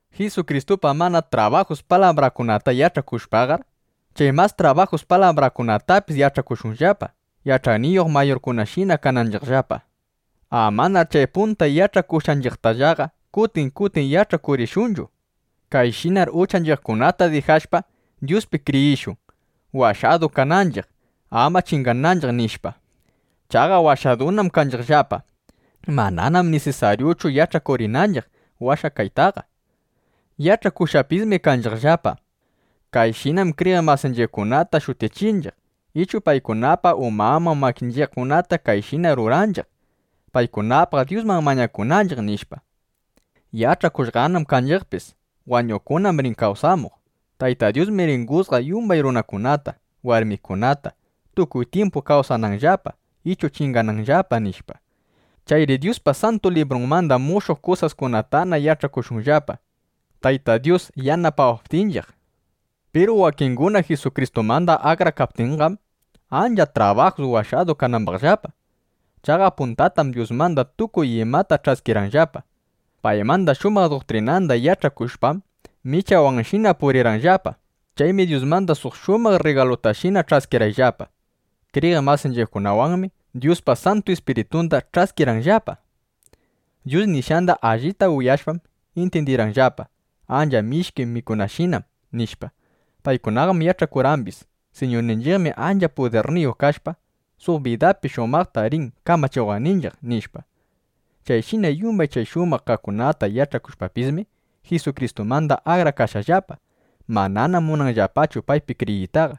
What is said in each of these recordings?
Jisukristupa mana trabajus palabrangunata yach'akushpaqar, chay mas trabajus palabrangunatapis yach'akushunllapa, yach'ayniyuq mayurkunashina kananchiqllapa. Amanar chay punta yach'akushqanchiqtallaqa kutin kutin yach'akurishunchu: Kayshinar uchanchiqkunata dijashpa, Dyuspi kriyishun, washadu kananchiq, ama chingananchiq, nishpa. (Chaqa washadunam kanchiqllapa. Mananam nisisaryuchu yach'akurinanchiq washakaytaqa.) Yach'akushqapismi kanchiqllapa: Kayshinam kriyiq masinchiqkunata shutichinchiq ichu paykunapa umanman makinchiqkunata kayshina ruranchiq, paykunapaq Dyusman mañakunanchiq nishpa. Yach'akushqanam kanchiqpis: Wañuqkunam rin kawsamuq. Tayta Dyusmi rin jusgaq yumbay runakunata, warmikunata, tukuy tyimpu kawsananllapa ichu chingananllapa, nishpa. Chayri Dyuspa Santu Librunmanda mushuq kusaskunatana yach'akushunllapa, Tayta Dyus yanapawaptinchiq. Piru wakinguna Jisukristumanda akrakaptinqam, ancha trabajus washadu kanambaqllapa. Chaqa puntatam Dyusmanda tukuy imata ch'askirqanllapa. Paymanda shumaq duktrinanda yach'akushpam, michawanshina purirqanllapa. Chaymi Dyusmanda suq shumaq rrigalutashina ch'askirqanllapa. Kriyiq masinchiqkunawanmi Dyuspa Santu Ispiritunda ch'askirqanllapa. Dyus nishqanda allita uyashpam, intyindirqanllapa: Ancha mishki mikunashinam, nishpa. Paykunaqam yach'akurqambis: Siñurninchiqmi ancha pudirniyuq kashpa, suq bidapi shumaqta rin kamachiwaqninchiq, nishpa. Chayshina yumbay chay shumaq kaqkunata yach'ashpapismi, Jisukristumanda akrakashqallapa. Mananam munanllapachu paypi kriyiytaqa.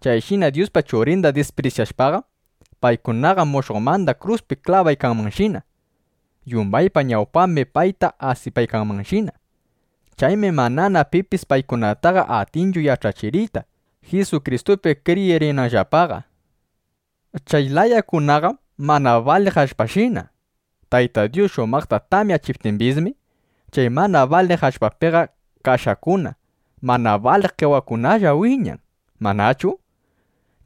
Chayshina Dyuspa Churinda disprisyashpaqam, paykunaqa mushuqmanda kruspi klabaykanmanshina. Yumbaypa ñawpambim payta asipaykanmanshina. Chaymi manana pipis paykunataqa atinchu yach'achiriyta, Jisukristupi kriyirinanllapaqa. Chay layakunaqam mana baliq allpashina. Tayta Dyus shumaqta tamyachiptimbismi, chay mana baliq allpapiqa kashakuna, mana baliq qewakunalla wiñan, ¿manachu?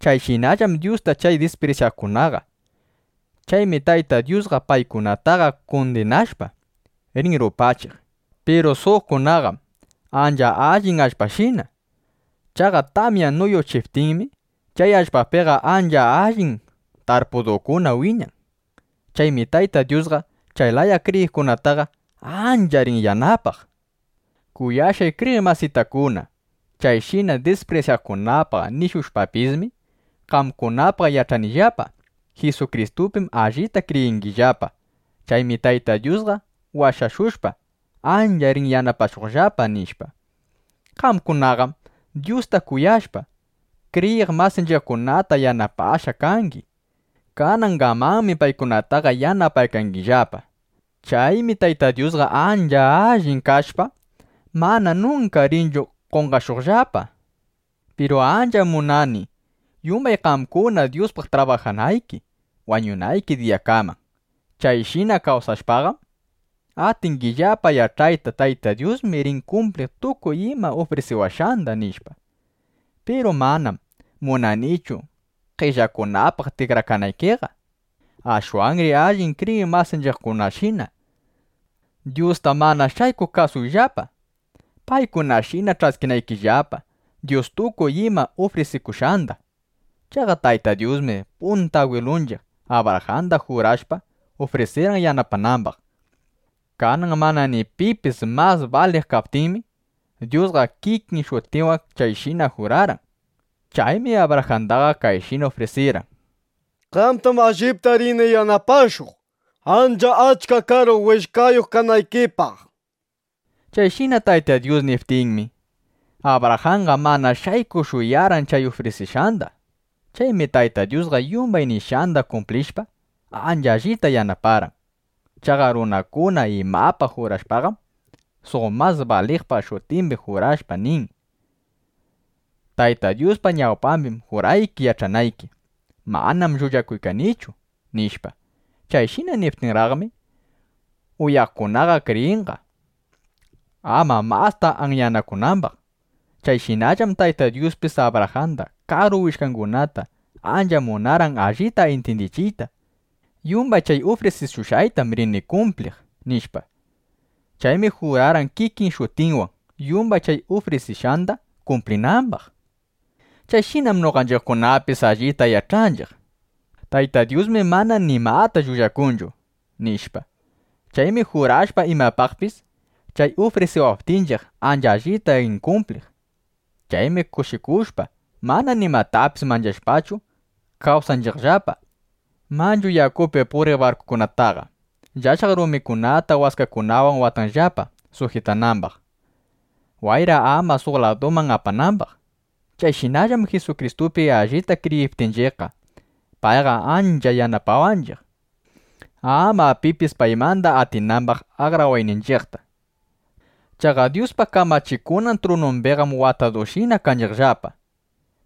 Chayshinallam Dyusta chay disprisyaqkunaqa. Chaymi Tayta Dyusqa paykunataqa kundinashpa, rin rupachiq. Piru suqkunaqam ancha allin allpashina. Chaqa tamya nuyuchiptinmi, chay allpapiqa ancha allin tarpudukuna wiñan. Chaymi Tayta Dyusqa chay laya kriyiqkunataqa ancha rin yanapaq. Kuyashqay kriyiq masitakuna, chayshina disprisyaqkunapaq nishushpapismi, qamkunapaq yach'anillapa: Jisukristupim allita kriyingillapa. Chaymi Tayta Dyusqa washashushpa, ancha rin yanapashuqllapa, nishpa. Qamkunaqam Dyusta kuyashpa, kriyiq masinchiqkunata yanapashqa kangi. Kanangamanmi paykunataqa yanapaykangillapa. Chaymi Tayta Dyusqa ancha allin kashpa, mana nunka rinchu qonqashuqllapa. Piru ancham munani, yumbay qamkuna Dyuspaq trabajanayki wañunayki diyakaman. Chayshina kawsashpaqam, atingillapa yach'ayta: Tayta Dyusmi rin kumpliq tukuy ima ufrisiwashqanda, nishpa. Piru manam munanichu qellakunapaq tikrakanaykiqa. Ashwanri allin kriyiq masinchiqkunashina Dyusta mana shaykuq kasuyllapa, paykunashina ch'askinaykillapa Dyus tukuy ima ufrisishushqanda. Chaqa Tayta Dyusmi punta agwilunchiq Abrajanda jurashpa, ufrisirqan yanapanambaq. Kanan mana ni pipis mas baliq kaptinmi, Dyusqa kikin shutinwan chayshina jurarqan. Chaymi Abrajandaqa kayshina ufrisirqan: “Qamtam allipta rini yanapashuq, ancha achka karu willkayuq kanaykipaq”, nishpa. Chayshina Tayta Dyus niptinmi, Abrajanqa mana shaykuq shuyarqan chay ufrisishqanda. Chaymi Tayta Dyusqa yumbay nishqanda kumplishpa, ancha allita yanaparqan. Chaqa runakuna imapaq jurashpaqam, suq mas baliqpa shutimbi jurashpa nin: “Tayta Dyuspa ñawpambim jurayki yach'anayki: Manam llullakuykanichu”, nishpa. Chayshina niptinraqmi, uyaqkunaqa kriyinqa, ama masta anyanakunambaq. Chayshinallam Tayta Dyuspis Abrajamba karu willkangunata ancha munarqan allita intyindichiyta: Yumbay chay ufrisishushqaytam rini kumpliq, nishpa. Chaymi jurarqan kikin shutinwan, yumbay chay ufrisishqanda kumplinambaq. Chayshinam noqanchiqkunapis allita yach'anchiq: Tayta Dyusmi mana nimata llullakunchu, nishpa. Chaymi jurashpa imapaqpis, chay ufrisiwaptinchiq ancha allita rin kumpliq. Chaymi kushikushpa, mana nimatapis manchashpachu, kawsanchiqllapa. Manchu yakupi puriq barkukunataqa llashaq rumikunata waskakunawan watanllapa sujitanambaq, wayra ama suq laduman apanambaq. Chayshinallam Jisukristupi allipta kriyiptinchiqqa, payqa ancha yanapawanchiq, ama pipis paymanda atinambaq akrawayninchiqta. Chaqa Dyuspa kamachikunan trunumbiqam watadushina kanchiqllapa.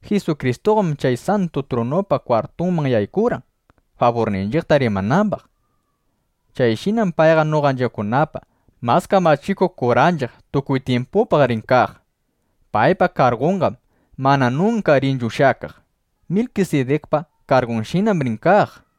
Jisukristuqam chay santu trunupa kwartunman yaykurqan, faburninchiqta rimanambaq. Chayshinam payqa noqanchiqkunapa mas kamachikuq kuranchiq tukuy tyimpupaq rin kaq. Paypa kargunqam mana nunka rinchu ushyakaq. Milkisidikpa kargunshinam rin kaq.